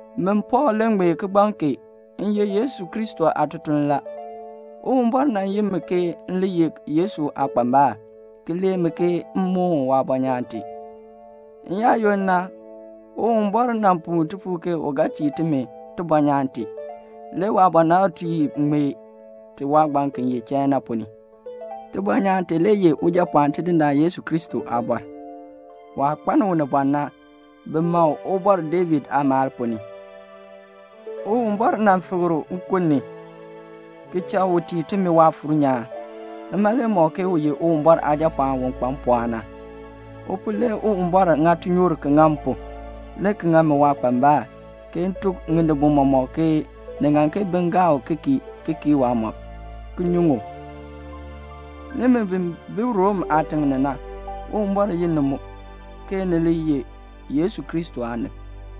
Min Pɔɔl le ŋmee kigbaŋ kee. M ye Yesu Kristo aatutuln la. Uwumbɔr nan yi mi ke m le ye Yesu aakpambal, ki lee mi ke m moon waabɔnyaan tee. N-yaayoonn na Uwumbɔr nan puu tipuul ke u ga tii timi tibɔnyaan tee. Le waabɔnabtiib ŋmee ti waagbaŋ ki ye chain na ponn ni. Tibɔnyaan tee le ye Ujapɔɔn Tidindaan Yesu Kristo aabɔr. Waah kpaln unibɔn na, bi ma u Ubɔr David aamaal ponn ni. Uwumbɔr nan fikr u nkun ni, ki cha u tii timi Waafuur nyaan. Nima le mɔk ke u ye Uwumbɔr Aajapɔɔn u kpa mpɔɔn na. U pu le Uwumbɔr ŋa tinyoor ki ŋa m pu, le ki ŋa mi waakpambal, ke m tuk ŋinibol mɔmɔk ke ni ŋan ke bin gaa u ki kii, ki kii waamɔb, ki nyuŋ u. Nimi bi bi Rom aatiŋ ni na, Uwumbɔr yi ni mu, ke ni li ye Yesu Kristo aanib.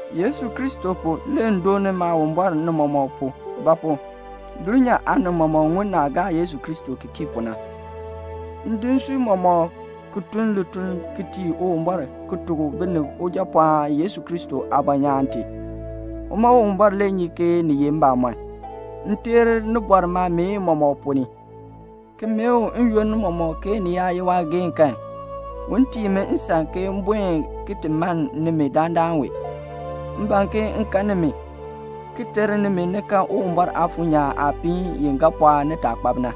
Yesu Kristo pu, le m dooni Maawumbɔr ni mɔmɔk pu; ba pu? dulnyaa aanib mɔmɔk ŋun naah gaa Yesu Kristo ki kii pu na. M di nsui mɔmɔk ki tun lituln ki tii Uwumbɔr ki tuk binib Ujapɔɔn Yesu Kristo aabɔnyaan tee. Uma Uwumbɔr le nyi ke ni ye mbamɔn, m teer nibɔr maameen mɔmɔk ponn ni, ki mee u n-yoonn mɔmɔk ke ni yaa ye waageehn kan, un tii mi nsan ke m buen ki ti mann nimi dandana wee. M ban ke m kan nimi, ki ter nimi ni kan Uwumbɔr Aafuur nyaan aapiin i ga pɔɔk nitaakpab na.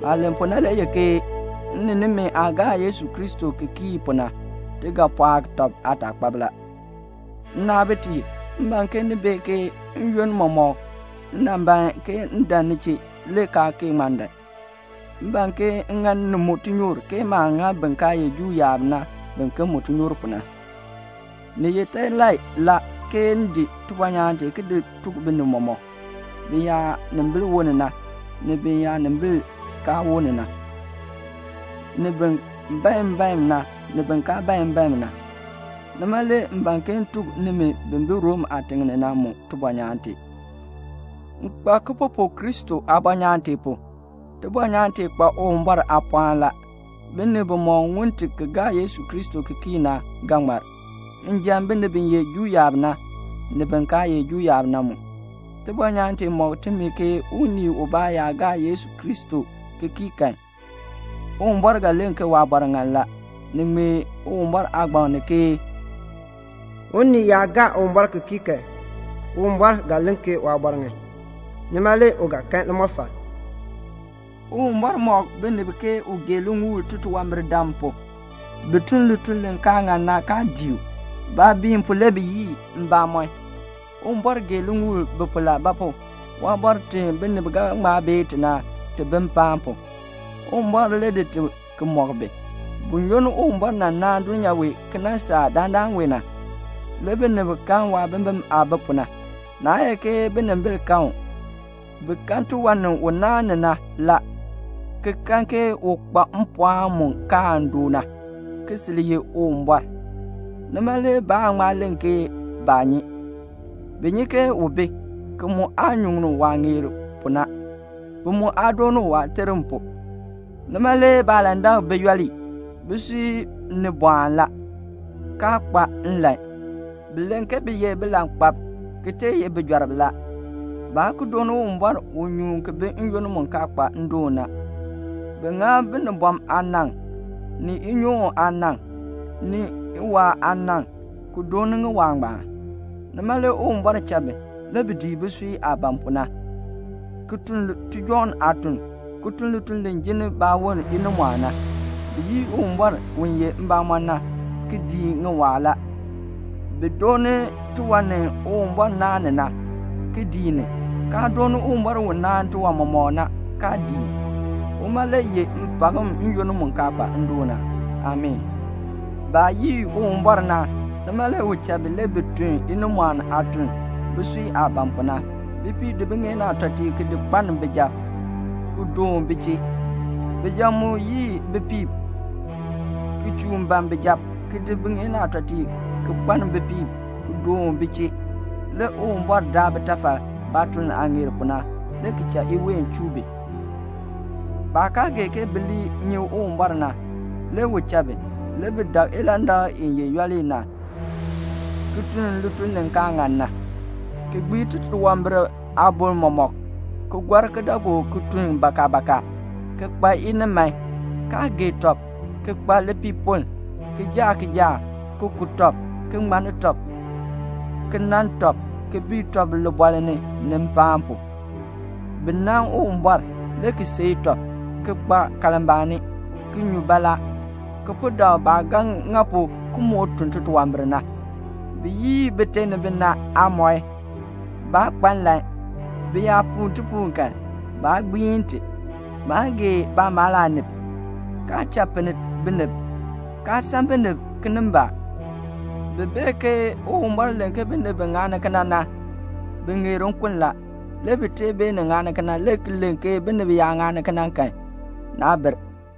Maah len pu na le ye ke m ni nimi aah gaa Yesu Kristo ki kii pu na, ti ga pɔɔk tɔb aataakpab la. Nnaabitiib, m ban ke ni bee ke n-yoonn mɔmɔk m nan ban ke m dan ni chee, le kaa kee ŋma dan. M ban ke m ŋa ni mu tinyoor, ke maah ŋa bin kaa ye Juu yaab na biken mu tinyoor pu na. Ni ye telai la, ke m di tibɔnyaan tee ki tuk binib mɔmɔk, biyaanimbil woln na, ni biyaanimbil kaa woln na, ni bin bae mbaen na, ni bin kaa bae mbaen na. Nima le m ban ke m tuk nimi bi bi Rom aatiŋ ni na mu tibɔnyaan tee. M kpa kipupuk Kristo aabɔnyaan tee pu. Tibɔnyaan tee kpa Uwumbɔr aapɔɔn la. Binib bimɔk ŋun ti ki gaa Yesu Kristo ki kii na ga ŋmar, bin ye Juu yaab na njan, ni bin kaa ye Juu yaab na mu. Tibɔnyaan tee mɔk timi ke unii ubaa yaa gaa Yesu Kristo ki kii kan, Uwumbɔr ga len ke waabɔr ŋan la. Ni ŋmee Uwumbɔr Aagbaŋ ni ke "Unii yaa gaa Uwumbɔr ki kii kan, Uwumbɔr ga len ke waabɔr ŋan. Nima le u ga kan limɔfal." Uwumbɔr mɔk binib ke u gee liŋuul titunwambirdam pu; bi tun lituln li kaa ŋan na kaa dii u. Baabiin pu le bi yii mbamɔn. Uwumbɔr gee liŋuul bi pu la; ba pu? waabɔr ti binib ga ŋma bee ti na, ti bi mpaan pu. Uwumbɔr le di ti ki mɔk bi. Buyoonn Uwumbɔr nan naan dulnyaa wee ki nan saa dandana wee na, le binib kan waabimbin aah bi pu na. Naa ye ke binimbil kan u. Bi kan tiwan ni u naan ni na la, ki kan ke u kpa mpɔɔn mu kaan doo na, ki sil ye Uwumbɔr. Nima le baan ŋma len ke baa nyi. Bi nyi ke u bi, ki mu aa nyuŋ u waah ŋeer pu na, ki mu aa dooni u waaterm pu. Nima le baalandak bi yooli. Bisui ni bɔɔn la, kaa kpa nlan. Bi len ke bi ye bilankpalb, ki tee ye bijɔrb la. Baa ki dooni Uwumbɔr u nyuun ki bi n-yoonn mu kaa kpa ndoon na. Bi ŋa binibɔm aanaŋ, ni inyoon aanaŋ, ni iwaa aanaŋ, ki dooni ŋiwaa ngbaan. Nima le Uwumbɔr cha bi, le bi dii bisui aah ban pu na, ki tun tijɔŋ aatuln, ki tun lituln li jinni baawon inimɔɔn na. Bi yii Uwumbɔr u ye mbamɔn na, ki dii ŋiwaa la. Bi dooni tiwan ni Uwumbɔr naan ni na, ki dii ni, kaa dooni Uwumbɔr u naan tiwan mɔmɔk na, kaa dii u. Uma le yeh mpakm n-yoonn mu kaa kpa ndoon na. Amii. Baah yii Uwumbɔr na, nima le u cha bi. Le bi tun inimɔɔn aatuln, bisui aah ban pu na. Bipiib di biŋeen aatɔtiib ki di kpaln bijab, ki doon bi chee la. Bijab mu yii bipiib, ki chuun ban bijab, ki di biŋeen aatɔtiib ki kpaln bipiib ki doon bi chee. Le Uwumbɔr daa bitafal, baatuln aah ŋeer pu na, le ki cha iween chuu bi. Baah kaa gee ke bi li nyi Uwumbɔr na, le u cha bi. Le bi dak ilandak i ye yooli na, ki tun lituln li kaa ŋan na, ki gbii titunwambir aaboŋ mɔmɔk. Bi gɔr kidaagook ki tun bakabaka, ki kpa iniman, kaa gee tɔb, ki kpa lipiipoln, ki jaa kijaak, ki ku tɔb, ki ŋmanni tɔb, ki nan tɔb, ki bii tɔb libɔɔl ni, ni mpaan pu. Bi nan Uwumbɔr, le ki seei tɔb, ki kpa kalmbaani, ki nyu baalaa. Bi po dak baah ga ŋa pu ki moo tun titunwambir na. Bi yii bite ni bina aamɔi. Baa kpa nlan. Bi yaa puu tipuul kan, baa gbiin ti. Baa gee baamaal aanib, kaa cha pinn binib, kaa san binib kinimbaak. Bi bee ke Uwumbɔr len ke binib bi ŋani kena na, bi ŋeer nkun la. Le bi tee beenin ŋani kena, le ki len ke binib yaa ŋani kena kan, naa bir.